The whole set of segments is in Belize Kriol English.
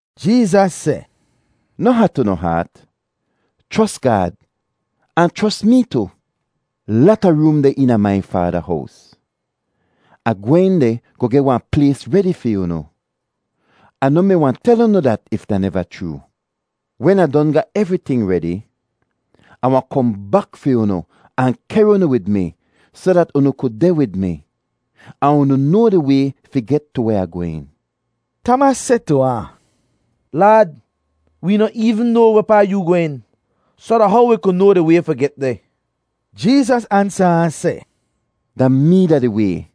Jeezas seh, “Noh hat unu haat. Chros Gaad ahn chros mee tu. Lata room deh eena mai Faada hows. Ah gwehn deh goh geh wahn plays redi fi unu. Ah noh mi wahn tel unu dat if da neva chroo. Wen Ah don ga evriting redi, Ah wahn kohn bak fi unu ahn kehr unu wid mi soh dat unu ku deh wid mi. Ahn unu noa di way fi get tu weh Ah gwehn.” Tamas seh tu ahn, “Laad, wee noh eevn noa wehpaa yu gwehn, soh da how wi ku noa di way fi get deh?” Jeezas ansa ahn seh, “Da mee da di way,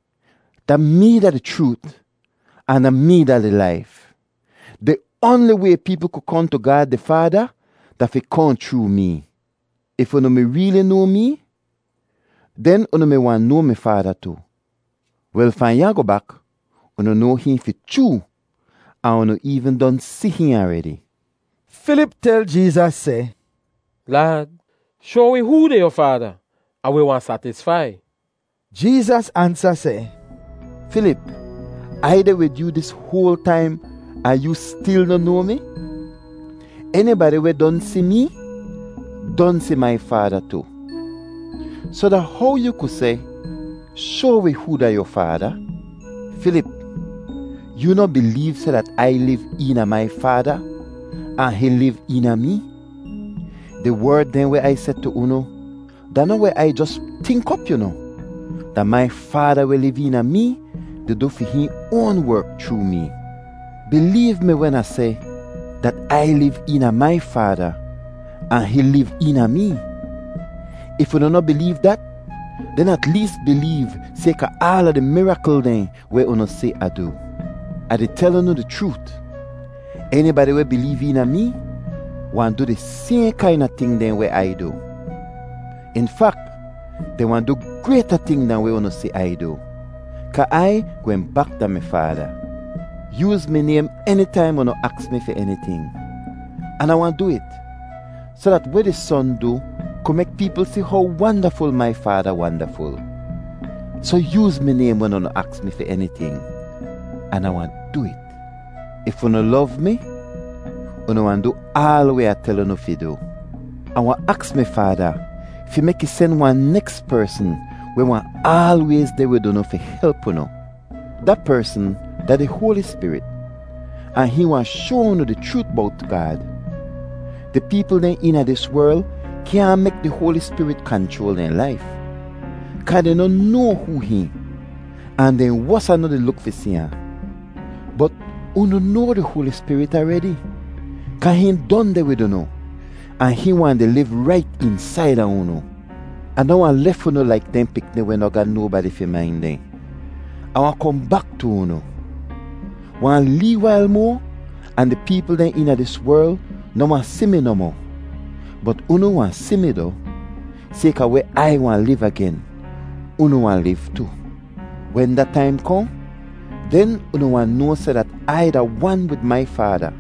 da mee da di chroot, ahn da mee da di laif. Di oanli way peepl ku kohn tu Gaad di Faada da fi kohn chroo mee. If unu mi reeli noa mee, den unu mi wahn noa mi Faada tu. Wel, fahn ya goh bak unu noa hihn fi chroo ahn unu eevn don si hihn aredi.” Filip tel Jeezas seh, “Laad, shoa wi hoo da yu Faada, ahn wi wahn satisfai.” Jeezas ansa seh, “Filip, Ai deh wid yoo dis hoal taim ahn yoo stil noh noa mi? Enibadi weh don si mee don si mai Faada tu. Soh da how yoo ku seh, ‘Shoa wi hoo da yu Faada’? Filip, yoo noh bileev seh dat Ai liv eena mai Faada, ahn hihn liv eena mee? Di werd dehn weh Ai seh tu unu da noh weh Ai jos tink op, yu noh; da mai Faada weh liv eena mee di du fi hihn oan werk chroo mee. Bileev mi wen Ah seh dat Ai liv eena mai Faada, ahn hihn liv eena mee. If unu noh bileev dat, den at lees bileev sayka aala di mirakl dehn weh unu si Ah du. “Ah di tel unu di chroot, enibadi weh bileev eena mee wahn du di sayhn kaina ting dehn weh Ai du. In fak, dehn wahn du grayta ting dahn weh unu si Ai du, kaa Ai gwehn bak da mi Faada. Yooz mi naym enitaim unu aks mi fi eniting, an Ah wahn du it, soh dat weh di Son du ku mek peepl si how wandaful mai Faada wandaful. Soh yooz mi naym wen unu aks mi fi eniting, an Ah wahn du it. “If unu lov mi, unu wahn du aal weh Ah tel unu fi du. Ah wahn aks mi Faada fi mek ih sen wahn neks persn weh wahn aalwayz deh wid unu fi help unu. Da persn da di Hoali Spirit ahn hihn wahn shoa unu di chroot bowt Gaad. Di peepl dehn eena dis werl kyaahn mek di Hoali Spirit kanchroal dehn laif, kaa dehn noh noa hoo hihn ahn dehn wosa noh di luk fi si ahn. Bot unu noa di Hoali Spirit aredi kaa hihn don deh wid unu, ahn hihn wahn di liv rait eensaida unu. “Ah noh wahn lef unu laik dehn pikni weh noh ga nobadi fi main dehn; Ah wahn kohn bak tu unu. Wahn lee wail moa ahn di peepl dehn eena dis werl noh wahn si mi nohmoh, bot unu wahn si mi doh. Sayka weh Ai wahn liv agen, unu wahn liv tu. Wen da taim kohn, den unu wahn noa seh dat Ai da wan wid mai Faada,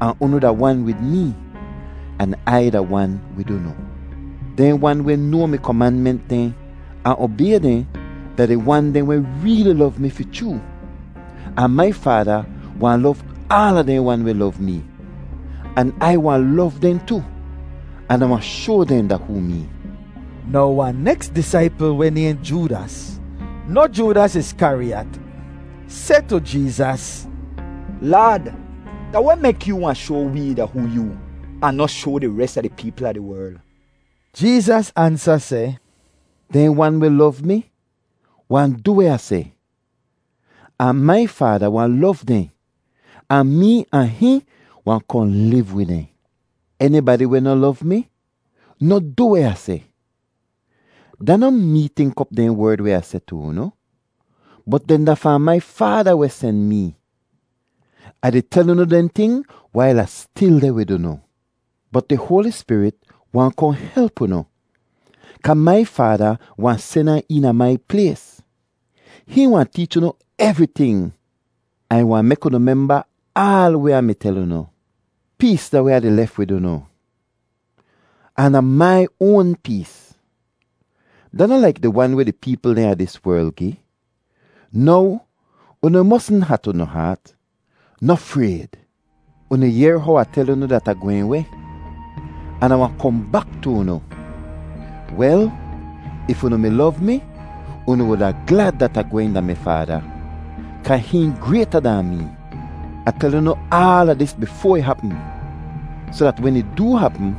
ahn unu da wan wid mee, an Ai da wan wid unu. Dehn wan weh noa mi komanment dehn, ahn obay dehn, da di wan dehn weh reeli lov mi fi chroo. Ahn mai Faada wahn lov aala dehn wan weh lov mee, an Ai wahn lov dehn tu, an Ah wahn shoa dehn da hoo mee.” Now wahn neks disaipl weh nayhn Joodas (noh Joodas Iskariyat) seh tu Jeezas, “Laad, da weh mek yoo wahn shoa wee da hoo yoo ahn noh shoa di res a di peepl a di werl?” Jeezas ansa seh, “Dehn wan weh lov mi wahn du weh Ah seh, ahn mai Faada wahn lov dehn, ahn mee ahn hihn wahn kohn liv wid dehn. Enibadi weh noh lov mi noh du weh Ah seh. Da noh mee tink op dehn werd weh Ah seh tu unu, bot dehn da fahn mai Faada weh sen mee. “Ah di tel unu dehn ting wail Ah stil deh wid unu. Bot di Hoali Spirit wahn kohn help unu, kaa mai Faada wahn sen ahn eena mai plays. Hihn wahn teech unu evriting ahn ih wahn mek unu memba aal weh Ah mi tel unu. “Pees da weh Ah di lef wid unu, ahn da mai oan pees; da noh laik di wan weh di peepl dehn a dis werl gi. Now unu mosn hat unu haat. Noh frayd. “Unu yehr how Ah tel unu dat Ah gwehn weh, an Ah wahn kohn bak tu unu. Wel, if unu mi lov mi, unu wuda glad dat Ah gwehn da mi Faada, kaa hihn grayta dahn mee. “Ah tel unu aala dis bifoa ih hapm soh dat wen ih doo hapm,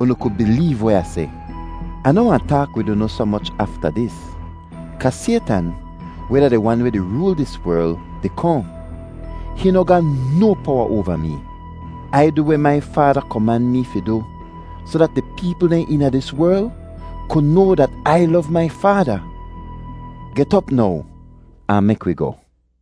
unu ku bileev weh Ah seh. Ah noh wahn taak wid unu soh moch afta dis, kaa Saytan, weh da di wan weh di rool dis werl, di kohn. Hihn noh ga no powa oava mee. Ai du weh mai Faada koman mee fi du soh dat di peepl dehn eena dis werl ku noa dat Ai lov mai Faada. “Get op now ahn mek wi goh.”